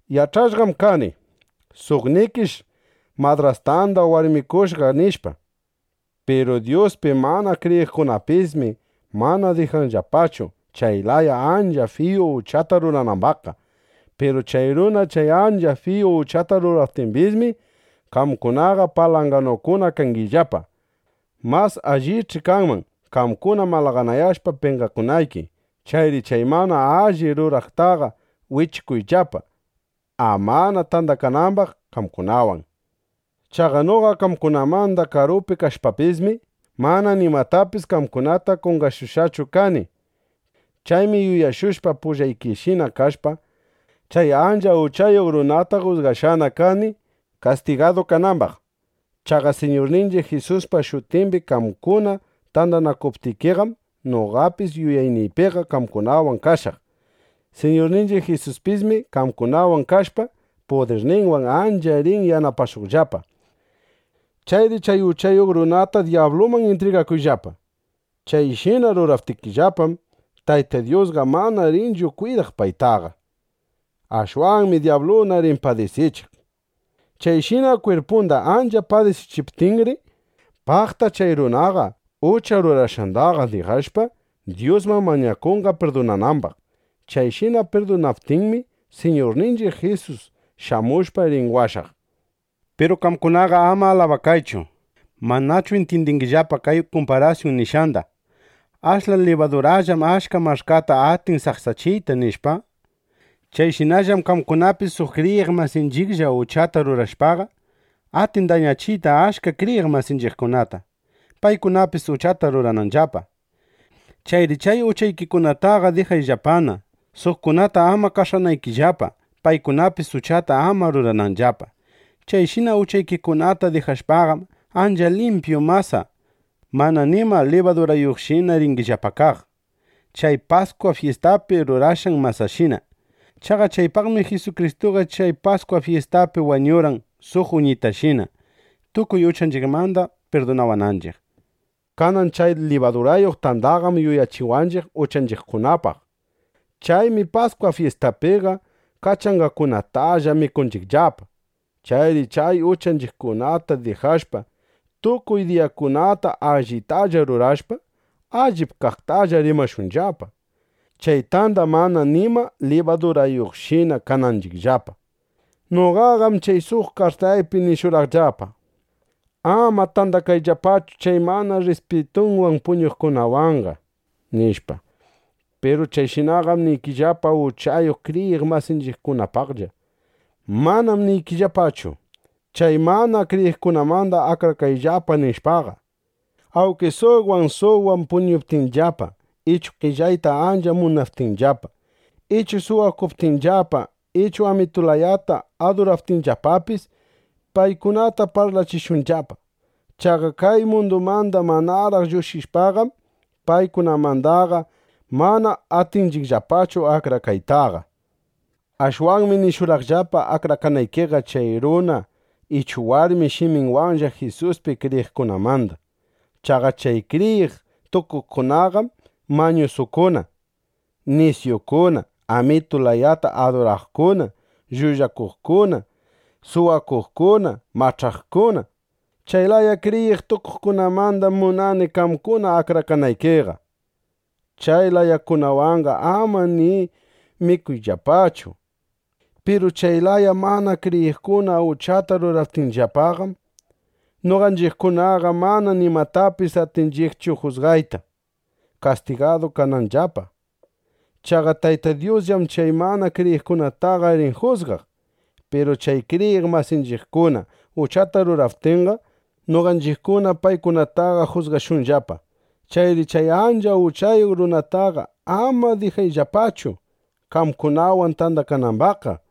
Yach'ashqam kani: Suqnikish madrastanda warmikushqa, nishpa. Piru Dyuspi mana kriyiqkunapismi mana dijanllapachu, chay laya ancha fiyu uchata ruranambaqqa. Piru chay runa chay ancha fiyu uchata ruraptimbismi, qamkunaqa palanganukuna kangillapa. Mas allich'i kanman, qamkuna malaganayashpa penqakunayki. Chayri chay mana alli ruraqtaqa wichukuyllapa, amana tandakanambaq qamkunawan. Chaqa noqa qamkunamanda karupi kashpapismi, mana nimatapis qamkunata qonqashushqachu kani. Chaymi yuyashushpa, pullaykishina kashpa, chay ancha uchayuq runata jusgashqana kani, kastigadu kanambaq. Chaqa Siñurninchiq Jisuspa shutimbi qamkuna tandanakuptikiqam, noqapis yuyayniypiqa qamkunawan kashaq. Siñurninchiq Jisuspismi qamkunawan kashpa, pudirninwan ancha rin yanapashuqllapa. Chayri chay uchayuq runata dyabluman intrigakuyllapa. Chayshina ruraptikillapam, Tayta Dyusqa manana rinchu kwidaq paytaqa. Ashwanmi dyabluna rin padisichiq. Chayshina kwirpunda ancha padisichiptinri, paqta chay runaqa ucha rurashqanda dijashpa, Dyusman mañakunqa pirdunanambaq. Chayshina pirdunaptinmi, Siñurninchiq Jisus shamushpa rin washaq. Piru qamkunaqa ama alabakaychu. ¿Manachu intyindingillapa kay kumparasyun nishqanda: “Ashla libadurallam achka mach'kata atin saksachiyta” nishpa? (Chayshinallam qamkunapi suq kriyiq masinchiqlla uchata rurashpaqa, atin dañachiyta achka kriyiq masinchiqkunata, paykunapis uchata rurananllapa.) Chayri chay uchaykikunataqa dijayllapana, suqkunata ama qash'anaykillapa, paykunapis uchata ama rurananllapa. Chayshina uchaykikunata dijashpaqam, ancha limpyu masa mana nima libadurayuqshina ringillapa kaq, chay Paskwa fyistapi rurashqan masashina. Chaqa chaypaqmi Jisukristuqa chay Paskwa fyistapi wañurqan suq uñitashina, tukuy uchanchiqmanda pirdunawananchiq. Kanan chay libadurayuq tandaqam yuyachiwanchiq uchanchiqkunapaq. Chaymi Paskwa fyistapiqa kachangakunatalla mikunchiqllapa. Chayri chay uchanchiqkunata dijashpa, tukuy diyakunata allitalla rurashpa, allip kaqtalla rimashunllapa, chay tanda mana nima libadurayuqshina kananchiqllapa. Noqaqam chay suq kartaypi nishurqaqllapa: “Ama tandakayllapachu chay mana rrispitunwan puñuqkunawanqa”, nishpa. Piru chayshinaqam niykillapa uchayuq kriyiq masinchiqkunapaqlla. Manam niykillapachu: “Chay mana kriyiqkunamanda akrakayllapa”, nishpaqa. Awnki suqwan, suqwan puñuptinllapa ichu qellayta ancha munaptinllapa, ichu suwakuptinllapa ichu amitu layata aduraptinllapapis, paykunata parlachishunllapa. Chaqa kay mundumanda manaraq lluqshishpaqam, paykunamandaqa mana atinchiqllapachu akrakaytaqa. Ashwanmi nishurqaqllapa akrakanaykiqa chay runa ichu warmi shiminwanlla Jisuspi kriyiqkunamanda. Chaqa chay kriyiq tukuqkunaqam mañusukuna, nisyukuna, amitu layata aduraqkuna, llullakuqkuna, suwakuqkuna, mach'aqkuna. Chay laya kriyiq tukuqkunamandam munani qamkuna akrakanaykiqa. Chay layakunawanqa ama ni mikuyllapachu. Piru chay mana kriyiqkuna uchata ruraptinllapaqam, noqanchiqkunaqa mana nimatapis atinchiqchu jusgayta, kastigadu kananllapa. Chaqa Tayta Dyusllam chay mana kriyiqkunataqa rin jusgaq. Piru chay kriyiq masinchiqkuna uchata ruraptinqa, noqanchiqkuna paykunataqa jusgashunllapa. Chayri chay ancha uchayuq runataqa ama dijayllapachu, qamkunawan tandakanambaqqa.